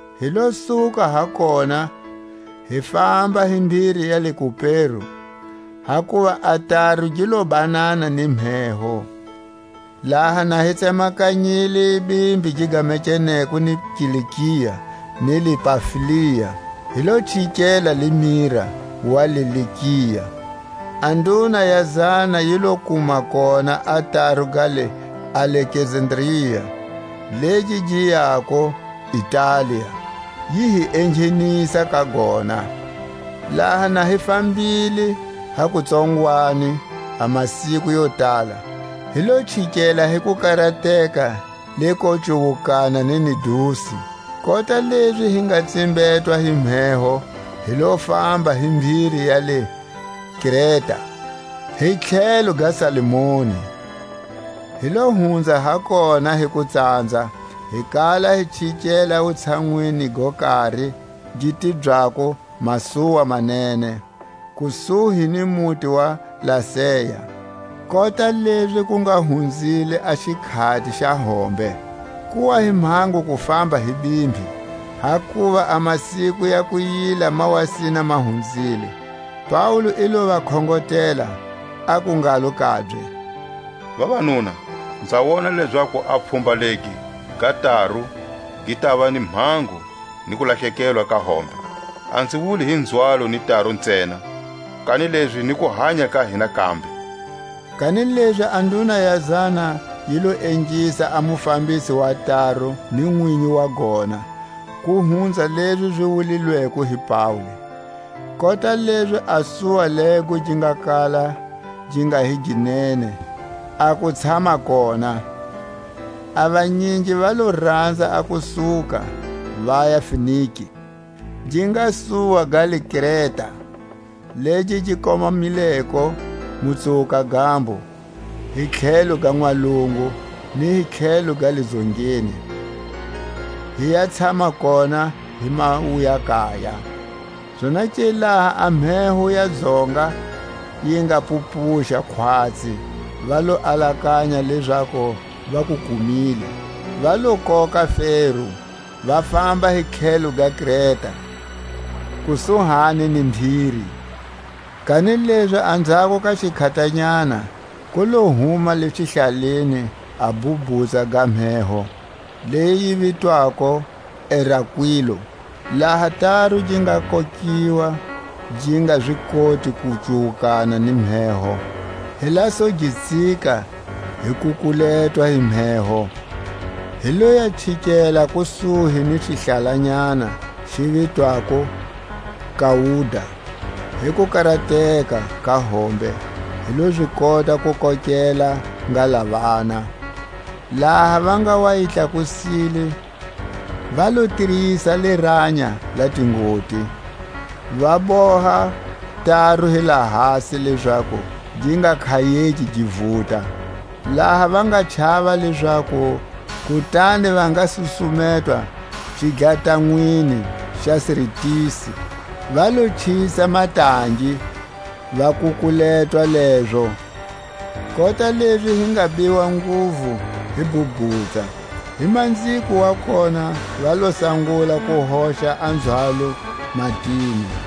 Hi lo suka ha kona, hi famba hi mbhiri ya le Kupero, hakuva a taru gi lo banana ni mheho. Laha na hi tsemakanyile bimbi gi gamekeneko ni Kilikia ni le Pamfilia, hi lo chikela le Mira wa le Likia. A nduna ya zana yi lo kuma kona a taru ga le Alekzandria, legi gi yako Italia; yi hi enghenisa ka gona. Laha na hi fambile ha kutsongwani a masiku yo tala, hi lo chikela hi kukarateka le ko cuwukana ni Nidusi; kota lezi hi nga tsimbetwa hi mheho, hi lo famba hi mbhiri ya le Kreta, hi tlhelo ga Salmone. Hi lo hunza ha kona hi kutsanza hi kala hi chikela wutshanwini go kari gi tibyako Masuwa ma Nene, kusuhi ni muti wa Lasea. Kota lezi ku nga hunzile a xikhati xa hombe, ku wa hi mhango ku famba hi bimbi, hakuva a masiku ya Kuyila ma wa sina ma hunzile, Paule i lo va khongotela, aku ngalo kabye; Vavanuna, nza wona lezaku a pfhumba legi ga taru gi tava ni mhango ni kulahlekelwa ka hombe; a nzi wuli hi nzhwalo ni taru ntsena, kanilezi ni kuhanya ka hina kambe. Kanilezi a nduna ya zana yi lo ingisa a mufambisi wa taru ni nwinyi wa gona, ku hunza lezi zi wulilweko hi Paule. Kota lezi a suwa lego gi nga kala gi nga hi gi nene a ku tshama kona, a vanyingi va lo ranza a ku suka, vaya Fenike, gi nga suwa ga le Kreta, legi gi komamileko Mutsuwuka-gambo hi tlhelo ga Nwalungu ni tlhelo ga le Dzongeni, hi ya tshama kona hi mawuya-kaya. Zonake laha a mheho ya Dzonga yi nga pupuxa khwatsi, va lo alakanya lezaku va ku kumile; va lo koka fero, va famba hi tlhelo ga Kreta, kusuhani ni mbhiri. A bhubhutsa. Kanilezi anzhako ka xikhatanyana ku lo huma le xihlaleni a bhubhutsa ga mheho, leyi yi vitwako Erakwilo. Laha taru gi nga kokiwa, gi nga zi koti ku cuwukana ni mheho, hi la su gi tsika, hi kukuletwa hi mheho. Hi lo ya chikela kusuhi ni xihlalanyana xi vitwako Kauda, hi kukarateka ka hombe hi lo zi kota ku kokela ngalavana. Laha va nga wa yi tlakusile, va lo tirisa liranya la tingoti, va boha taru hi lahasi lezaku gi nga khayeki gi vuta; laha va nga chava lezaku kutani va nga susumetwa xidlatanweni xa Sirtisi, va lo chisa matangi, va kukuletwa lezo. Kota lezi hi nga biwa nguvu hi bhubhutsa, hi manziko wa kona va lo sangula ku hoxa a nzhwalo matini.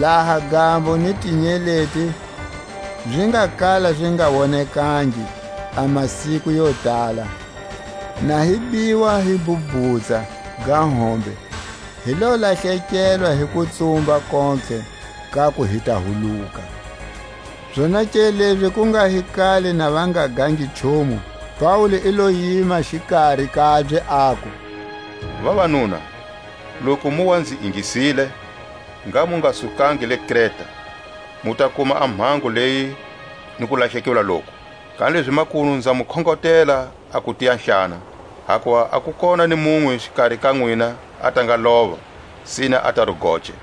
Laha gambo ni tinyeleti zi nga kala zi nga wonekangi a masiku yo tala, na hi biwa hi bhubhutsa ga hombe, hi lo lahlekelwa hi kutsumba kontlhe kaku hi ta huluka. Zonake lezi ku nga hi kale na va nga gangi nchumu, Paule i lo yima xikari kabye, aku: Vavanuna, loku mu wa nzi ingisile, ngha mu nga sukangi le Kreta, mu ta kuma a mhango leyi ni kulahlekelwa loku. Kanilezi makunu nza mu khongotela a ku tiyahlana; hakuva a ku kona ni munwe xikari ka nwina a ta nga lova, sine a taru goce.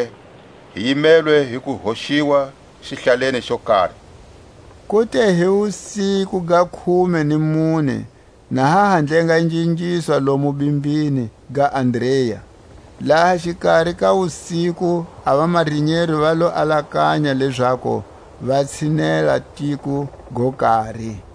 Ahemba-lokoke, hi yimelwe hi ku hoxiwa xihlaleni xo kari. Ku te hi wusiku ga khume ni mune, na ha ha ndlengandlengiswa lomu bimbini ga Adria, laha xikari ka wusiku a vamarinyero va lo alakanya lezaku va tshinela tiko go kari;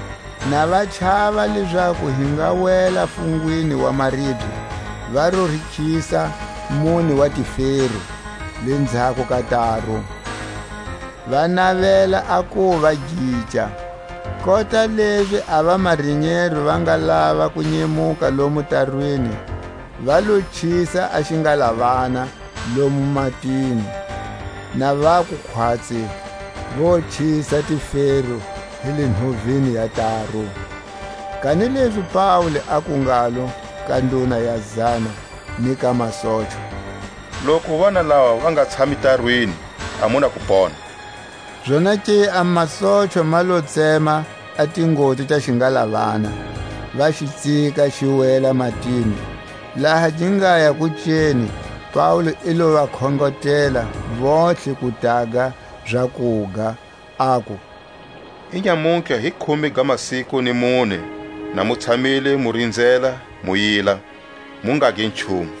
Na va chava lezaku hi nga wela fungwini wa maribye, va lo rikhisa mune wa tifero lenzhako ka taru, va navela a kuva gica. Kota lezi a vamarinyero va nga lava ku nyemuka lomu tarwini, va lo chisa a xingalavana lomu matini, na vaku khwatsi vo chisa tifero hi le nhovini ya taru. Kanilezi Paule aku ngalo ka nduna ya zana ni ka masochwa: Loku vanalava va nga tshami tarwini, a mu na ku pona. Zonake a masochwa ma lo tsema a tingoti ta xingalavana, va xi tsika, xi wela matini. Laha gi ngaya kuceni, Paule i lo va khongotela vontlhe ku taga zakuga, aku: Inyamutlha hi khume ga masiku ni mune na mu tshamile mu rinzela mu yila, mu ngagi nchumu.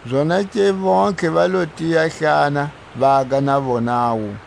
Zonake vontlhe va lo tiya-hlana, vaga na vonawu.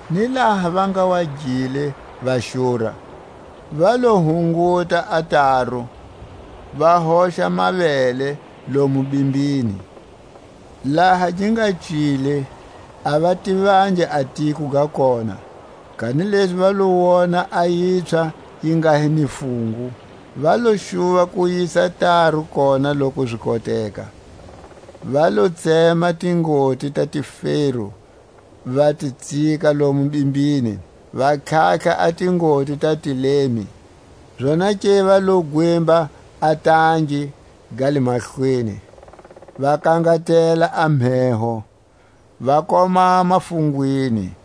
Ni laha va nga wa gile va xura, va lo hunguta a taru, va hoxa mavele lomu bimbini. Laha gi nga cile, a va tivangi a tiko ga kona; kanilezi va lo wona a yipswha yi nga hi ni fungu, va lo xuva ku yisa taru kona loku zi koteka. Va lo tsema tingoti ta tifero, va ti tsika lomu bimbini, va tlhatlha a tingoti ta tilemi; zonake va lo gwimba a tangi ga le mahlweni, va kangatela a mheho, va komama fungwini.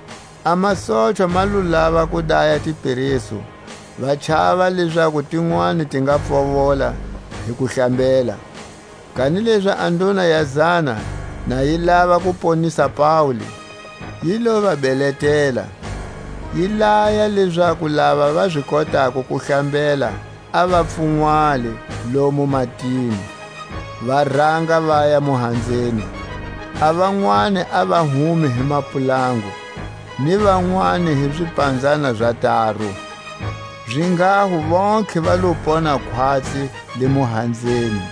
A masochwa ma lo lava ku daya tiperesu, va chava lezaku tinwani ti nga pfovola hi ku hlambela. Kanilezi a nduna ya zana, na yi lava ku ponisa Paule, yi lo va beletela; yi laya lezaku lava va zi kotako ku hlambela, a va pfunwala lomu matini, va ranga vaya muhanzeni; a vanwani a va hume hi mapulangu, ni vanwani hi zipanzana za taru. Zinghaho vontlhe va lo pona khwatsi le muhanzeni.